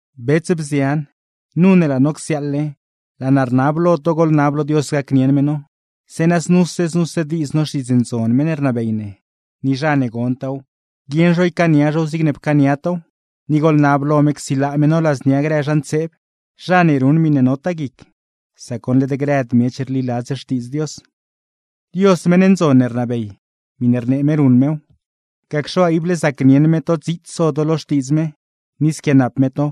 Bets, bzian, nu ne laa no csiaaḻle, laa naa rnab lo to goḻnab lo Dios gacnieṉ me no, zeeṉa znuse znuse diiz no Xtiidz Ndzon meṉ ne rnabey ne; ni zha ne gontaaw, guieṉ zho ycaania zhow zigne pcaania tow. Ni goḻnab lo me csilaa me no ladznia grë zha ntseeb, zha ne ruṉ miṉe notaa guic; sac goṉ led grëd miech rliladz Xtiidz Dios. Dios meṉ ndzon ne rnabey, miṉe rnee me ruṉ mew; gacxe waa, ible zacnieṉ me to dziits so to lo Xtiidz me, ni squianap me to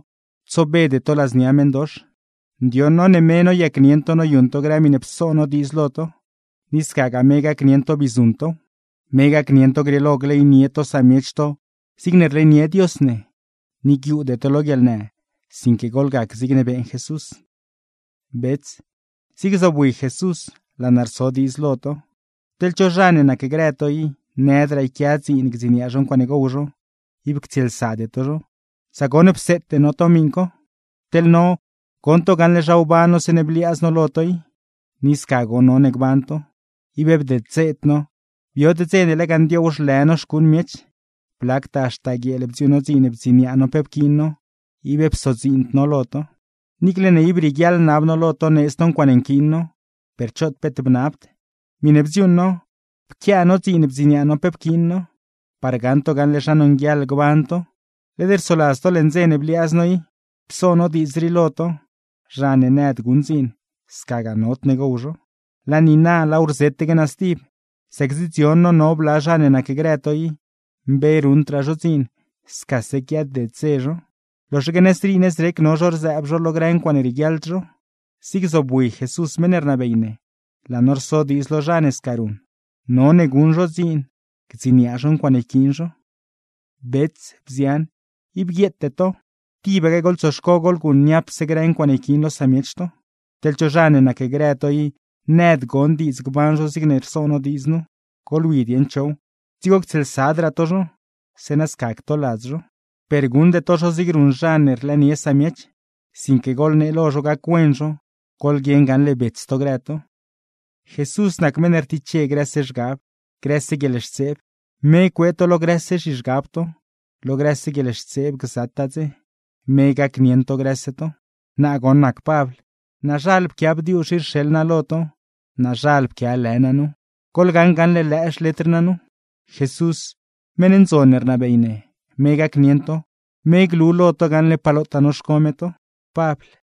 tsobede to ladznia meṉdox. Ndioṉ no ne me noyacnieṉ to noyuṉ to grë miṉe pso no diidz lo to, ni scagaa me gacnieṉ to bii guṉ tow. Me gacnieṉ to grieelo gleynie to samiech to zigne rleynie Dios ne, ni guiuude to lo guieḻnë, sinque goḻgac zigne beeṉ Jesús. Bets zig zobwi Jesús, laa no rso diidz lo to: Teḻ cho zha ne nacgrë to i, nëdraa yquia dziin gdziniaa zho ncuaaṉe gow zho, ib ctsieelsade to zho; sac goṉ pseete no to miṉ co. Teḻ no, goṉ to gaṉle zha wban no zeeṉe bliaaz no lo to i; ni sca goṉ none gban to. Ib bdeddzeed no, biod dze ne lega ndioow zhlë no xcuuṉ miech, blactaa haxta guieel bdziuuṉ no dziin bdziniaa no pe pquiin no; ib psodziind no lo to. Niicle ne ib rieguiaḻ nab no lo to needz to ncuaaṉe nquiin no, per choot peet bnabd. Miṉe bdziuuṉ no pquiaa no dziin bdziniaa no pe pquiin no, par gaṉ to gaṉle zha nonguieḻ gban to. Led rsoladz to leṉ dze ne bliaaz no i, pso no diidz rii lo to: Zha ne nëd guṉ dziin, scagaa nodne gow zho. Laa niina laaw rzetaque naa stib, sac zidzion no no bla zha ne nacgrë to i, mbe ruṉdraa zho dziin scase quiaded dze zho; loxaque nëzrii nëzrec no zho rzëëb zho lo grë ncuaaṉe rieguiaḻd zho. Zig zobwi Jesús meṉ ne rnabey ne, laa no rso diidz lo zha ne sca ruṉ: none guṉ zho dziin gdziniaa zho ncuaaṉe yquiin zho. Bets, bzian, ib guieete to, tibaque goḻtsoxco goḻguṉ niapse grë ncuaaṉe yquiin lo samiech to. Teḻ cho zha ne nacgrë to i nëd gon diidz gban zho zigne rso no diidz nu, goḻwi dieṉ chow, dzigo ctsieelsadraa to zho; zeeṉa sca ctoladz zho. Per guṉde to zho zig ruṉ zha ne rlëënie samiech, sinque goḻnee lo zho gac-wen zho; goḻguieṉ gaṉle bets to grë to. Jesús nac meṉ ne rtiche grëse zhgab, grëse guieḻxtseeb, me cuee to lo grëse zhizhgab to, lo grëse guieḻxtseeb gzataa dze. Me gacnieṉ to grëse to. Naa goṉ nac Pabl, naazhal pquia bdiuzh rii rxeḻ naa lo to; naazhal pquia lë naa nu. Goḻgaṉ gaṉle lëë xletr naa nu. Jesús meṉ ndzon ne rnabey ne, me gacnieṉ to, me glu lo to gaṉle pa lotaa noxco me to. Pabl